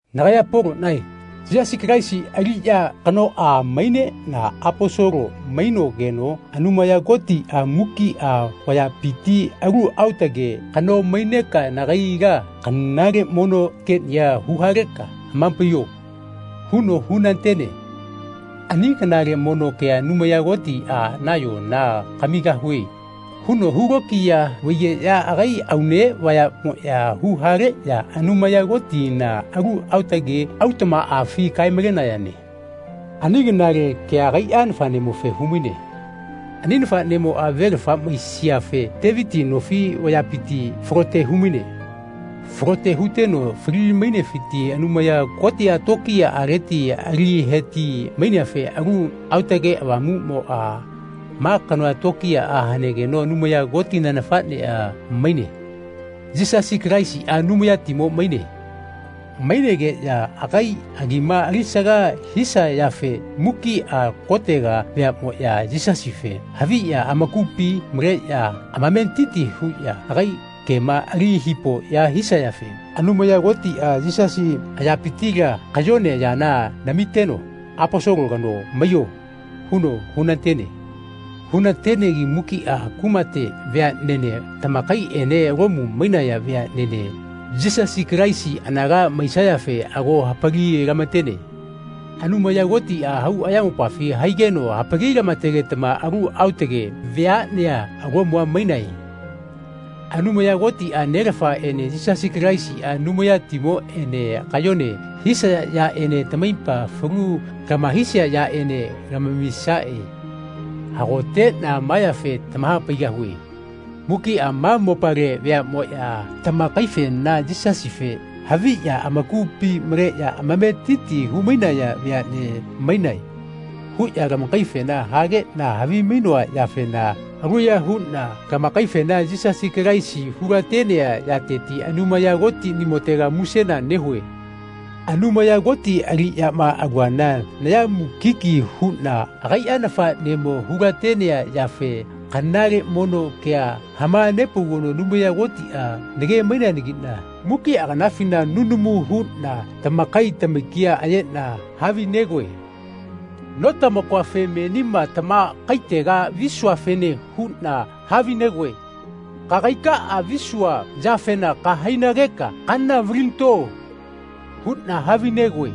Nagaya Poloꞌnae Yisasi Kalaisi aliꞌya kanoꞌa maineꞌna Aposolo mainogeno Anumaya Kotiꞌa mukiꞌa vayapiti “Alu aotage kano maineka nagaila kanale mono keꞌnia huhaleka hamapaiyo.” huno hunatene. Ani kanale mono kea Anumaya Kotiꞌa nayona “Kamigahue.” huno hulokiya vaigeꞌya agai aune vayaꞌmoꞌya huhaleꞌya Anumaya Kotina alu aotage autaꞌmaꞌafi kae-malenayane. Ani kanale kea agaiꞌa Nafaꞌnemofe humaine. Ani Nafaꞌnemoꞌa velafa maisiafe Teviti nofi vayapiti falote humaine. Falote huteno fali-mainefiti Anumaya Kotiꞌa tokiyaꞌaleti aliheti-maineafe Alu Aotage Avamuꞌmoꞌa “Ma kanoa tokiyaꞌa hanegeno Anumaya Kotina Nafaꞌneꞌa maine. Yisasi Kalaisiꞌa Anumayatimo maine.” Mainegeꞌya agai agima alisaga hisayafe mukiꞌa kotega veaꞌmoꞌya Yisasife haviꞌya amakupi maleꞌya amametiti huꞌya agai kema ali hipoꞌya hisayafe Anumaya Kotiꞌa Yisasi ayapitila kayone yana namiteno “Aposolo kano maiyo.” huno hunatene. Hunatenegi mukiꞌa kumate veaꞌnene tamakaiꞌene Lomu mainaya veaꞌnene Yisasi Kalaisi anaga maisayafe ago hapali-lamatene. Anumaya Kotiꞌa hau ayamopafi haigeno hapali-lamategetama alu aotage veaꞌnea Lomua mainae. Anumaya Kotiꞌa, Nelafaꞌene Yisasi Kalaisiꞌa, Anumayatimoꞌene kayone hisaya yaꞌene tamaipa falu lamahaisia yaꞌene tamamisaꞌe. Hagoteꞌna ma yafe tamahapaigahue. Mukiꞌa ma mopale veaꞌmoꞌya tamakaifena “Yisasife haviꞌya amakupi maleꞌya amametiti humainaya veaꞌne mainae.” huꞌya lamakaifena hageꞌna havimainoa yafena aluya huꞌna lamakaifena Yisasi Kalaisi hulatenea yateti Anumaya Kotiꞌnimotega musena nehue. Anumaya Koti aliꞌyama aluana naya mukiki huꞌna agaiꞌa Nafaꞌnemo hulatenea yafe kanale mono kea hamanepaugeno Anumaya Kotiꞌa nage-maineanagiꞌna mukiꞌa kanafina nunamu huꞌna tamakai tamakia ayeꞌna havinegoe. Notamakoafe menima tamakaitega visuafene huꞌna havinegoe “Kagaika visua yafema kahainageka kana valinato.” huꞌna havinegoe.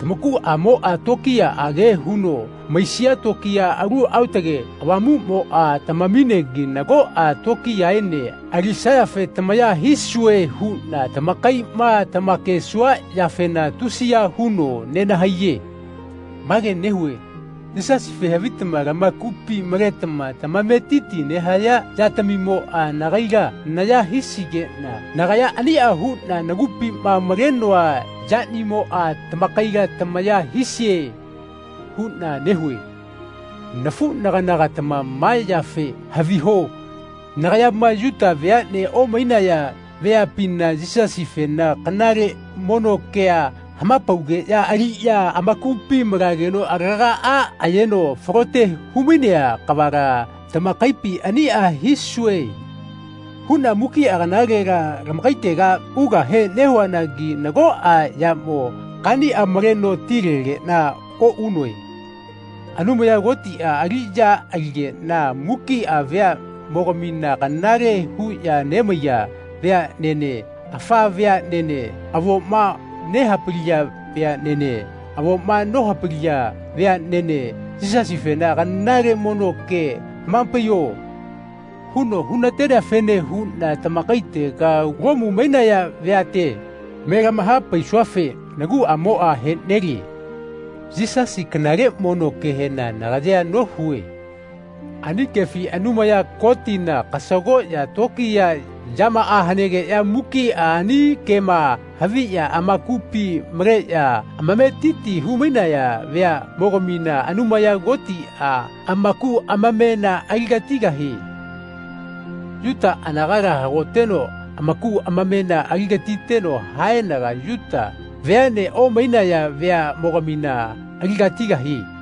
Tamakuꞌamoꞌa tokiyaꞌage huno maisia tokiya, Alu Aotage Avamuꞌmoꞌa tamaminegi nagoꞌa tokiyaene alisayafe tamaya hisue huꞌna tamakaiꞌma tamakesua yafena tusiya huno nenahaiye. Mage nehue “Yisasife havitama lamakupi maletama tamametiti nehaya yatamimoꞌa nagaila naya hisigeꞌna nagaya aniꞌa huꞌna nagupima malenoa yanimoꞌa tamakaila tamaya hisie.” huꞌna nehue. Nafuꞌnaganagatama ma yafe haviho nagayama Yuta veaꞌne omainaya veapina Yisasifena kanale mono kea hamapaugeꞌya aliꞌya amakupi malageno alagaꞌa ayeno falote humainea kavala tamakaipi “Aniꞌa hisue.” huꞌna mukiꞌa kanalela tamakaitega ugahe nehuanagi nagoꞌa yamo kaniꞌa maleno tilegeꞌna oꞌunoe. Anumaya Kotiꞌa aliꞌya aligeꞌna mukiꞌa veaꞌmogamina kanale huꞌya nemaiya veaꞌnene, afa veaꞌnene, avoma nehapaliya veaꞌnene, avoma nohapaliya veaꞌnene “Yisasifena kanale mono kea hamapaiyo.” huno hunateneafene huꞌna tamakaitega, Lomu mainaya veate, me lamahapaisuafe naguꞌamoꞌa heꞌnelie. Yisasi kanale mono kehena nagayea nohue. Ani kefi Anumaya Kotina kasagoꞌya tokiya yamaꞌa hanegeꞌya mukiꞌa ani kema haviꞌya amakupi maleꞌya amametiti humainaya veaꞌmogamina Anumaya Kotiꞌa amaku amamena aligatigahie. Yuta anagala hagoteno amaku amamena aligatiteno haenaga Yuta veaꞌne omainaya veaꞌmogamina aligatigahie.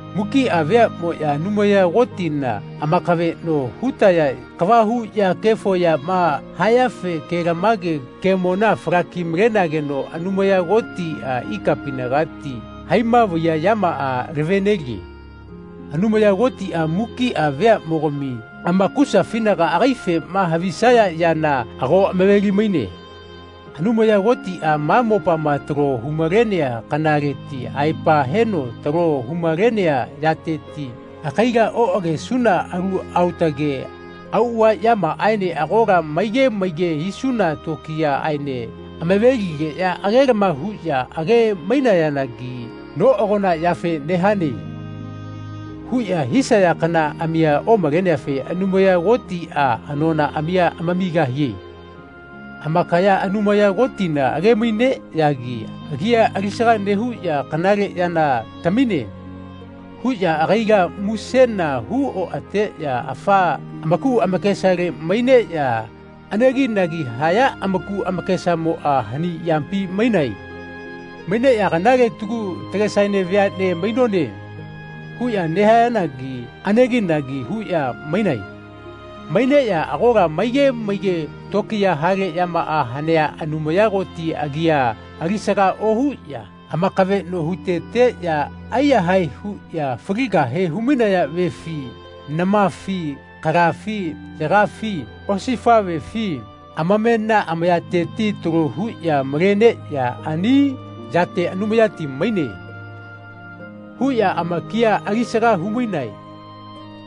Mukiꞌa veaꞌmoꞌya Anumaya Kotina amakaveꞌno hutaya kava huꞌya kefo yama hayafe kelamage kemona falaki-malenageno Anumaya Kotiꞌa ikapinagati haima vaiya yamaꞌa lavenelie. Anumaya Kotiꞌa mukiꞌa veaꞌmogami amakusafinaga agaifema havisaya yana ago amaveli-maine. Anumaya Kotiꞌa ma mopama talo humalenea kanaleti aepa heno talo humalenea yateti agaila oꞌagesuna alu aotage auꞌava yamaꞌaene agola maige maige hisuna tokiyaꞌaene amaveligeꞌya agelama huꞌya age-mainayanagi “Noꞌagona yafe nehane.” huꞌya hisaya kanaꞌamia omaleneafe Anumaya Kotiꞌa anonaꞌamia amamigahie. Amakaya Anumaya Kotina agemaineꞌyagi agia alisaga nehuꞌya “Kanale yana tamine.” huꞌya agaila musena hu oꞌateꞌya afa amaku amakesale maineꞌya aneginagi haya amaku amakesamoꞌa hani yapi mainae. Maineꞌya “Kanale tagu tagesaene veaꞌne mainone.” huꞌya nehayanagi aneginagi huꞌya mainae. Maineꞌya agola maige maige tokiya hale yamaꞌa hanea Anumaya Koti agia alisaga ohuꞌya amakaveꞌno huteteꞌya aiyahae huꞌya faligahe humainaya vefi, namafi, kala yagafi, osifaꞌvefi, amamena amayateti talo huꞌya maleneꞌya ani yate “Anumayati maine.” huꞌya amakia alisaga humainae.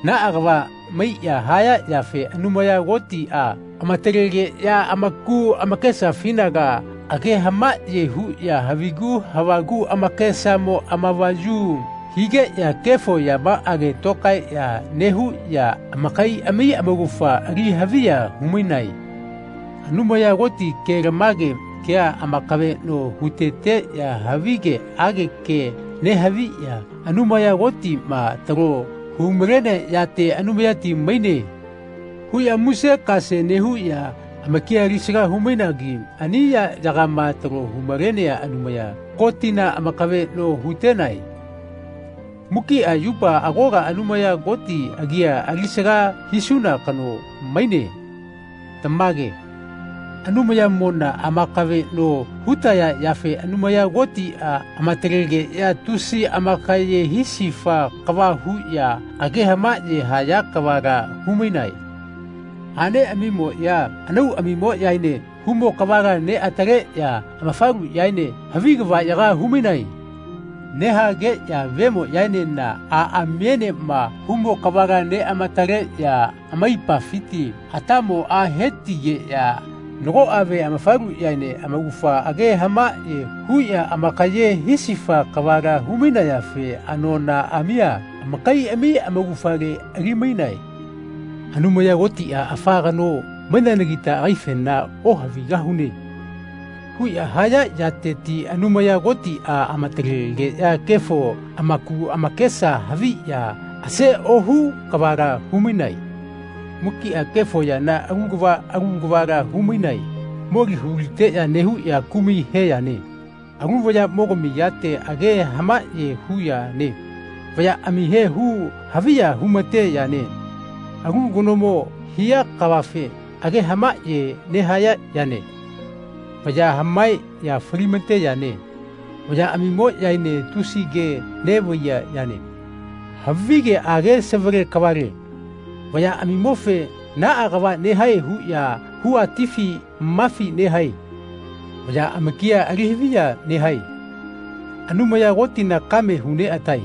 Naꞌa kava maiꞌya haya yafe Anumaya Kotiꞌa amatalegeꞌya amaku amakesafinaga age hamaꞌye huꞌya havigu havagu amakesamo amavayu higeꞌya kefo yamaꞌage tokaeꞌya nehuꞌya amakaiꞌami amaugafa ali haviya humainae. Anumaya Koti kelamage kea amakaveꞌno huteteꞌya havigeꞌage ke nehaviꞌya Anumaya Kotiꞌma talo humalenea yate “Anumayati maine.” huꞌya muse-kase nehuꞌya amakia alisaga humainagi ani yaꞌyagama talo humalenea Anumaya Kotina amakaveꞌno hutenae. Mukiꞌa yupa agola Anumaya Koti agia alisaga hisuna kano maine. Tamage. Anumayamona amakaveꞌno hutaya yafe Anumaya Kotiꞌa amatalegeꞌya tusi amakaye hisifa kava huꞌya age hamaꞌye haya kavala humainae. Aꞌneꞌamimoꞌya anauꞌamimoꞌyaene humo kavala neꞌataleꞌya amafaluꞌyaene havi kavaꞌyaga humainae. Nehageꞌya vemoꞌyaenena aꞌamienama humo kavala neꞌamataleꞌya amaipafiti atamoꞌa hetigeꞌya nagoꞌa ve amafaluꞌyaene amaugafa age hamaꞌye huꞌya amakaye hisifa kavala humainayafe anonaꞌamia amakaiꞌami amaugafale alimainae. “Anumaya Kotiꞌa afa kano maineanagita agaifena ohavigahune.” huꞌya haya yateti Anumaya Kotiꞌa amatalegeꞌya kefo amaku amakesa haviꞌya ase ohu kavala humainae. Mukiꞌa kefo yana alu kava alu kavala humainae. Moli huliteꞌya nehuꞌya kumai he yane. Alu vayaꞌmogami yate age hamaꞌye hu yane. Vayaꞌamihe hu-haviya humate yane. Alu kanomo hia kavafe age hamaꞌye nehaya yane. Vaya hamaeꞌya falimate yane. Vayaꞌamimoꞌyaene tusi ke neꞌvaiya yane. Havigeꞌage savale kavale. Vayaꞌamimofe “Naꞌa kava nehae.” huꞌya huatifi mafi nehae. Vaya amakia alihaviya nehae. Anumaya Kotina kame huneꞌatae.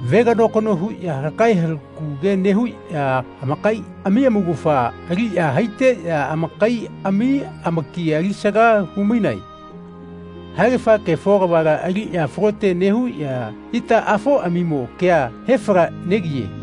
Veganokano huꞌya halakae halakau ke nehuꞌya amakaiꞌami amaugafa aliꞌya haiteꞌya amakaiꞌami amaki alisaga humainae. Haegafa kefo kavala aliꞌya falote nehuꞌya itaꞌafoꞌamimo kea hefalaꞌnegiye.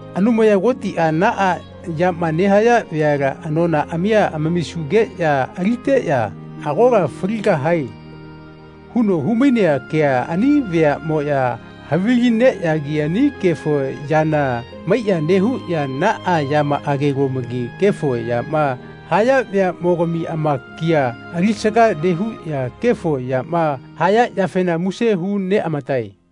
Anumaya Kotiꞌa “Naꞌa yama nehaya veala anonaꞌamia amamisugeꞌya aliteꞌya agola faligahae.” huno humainea kea ani veaꞌmoya havilineꞌyagi ani kefo yana maiꞌya nehuꞌya naꞌa yamaꞌagelomagi kefo yama haya veaꞌmogami amakia alisaga nehuꞌya kefo yama haya yafena muse hu neꞌamatae.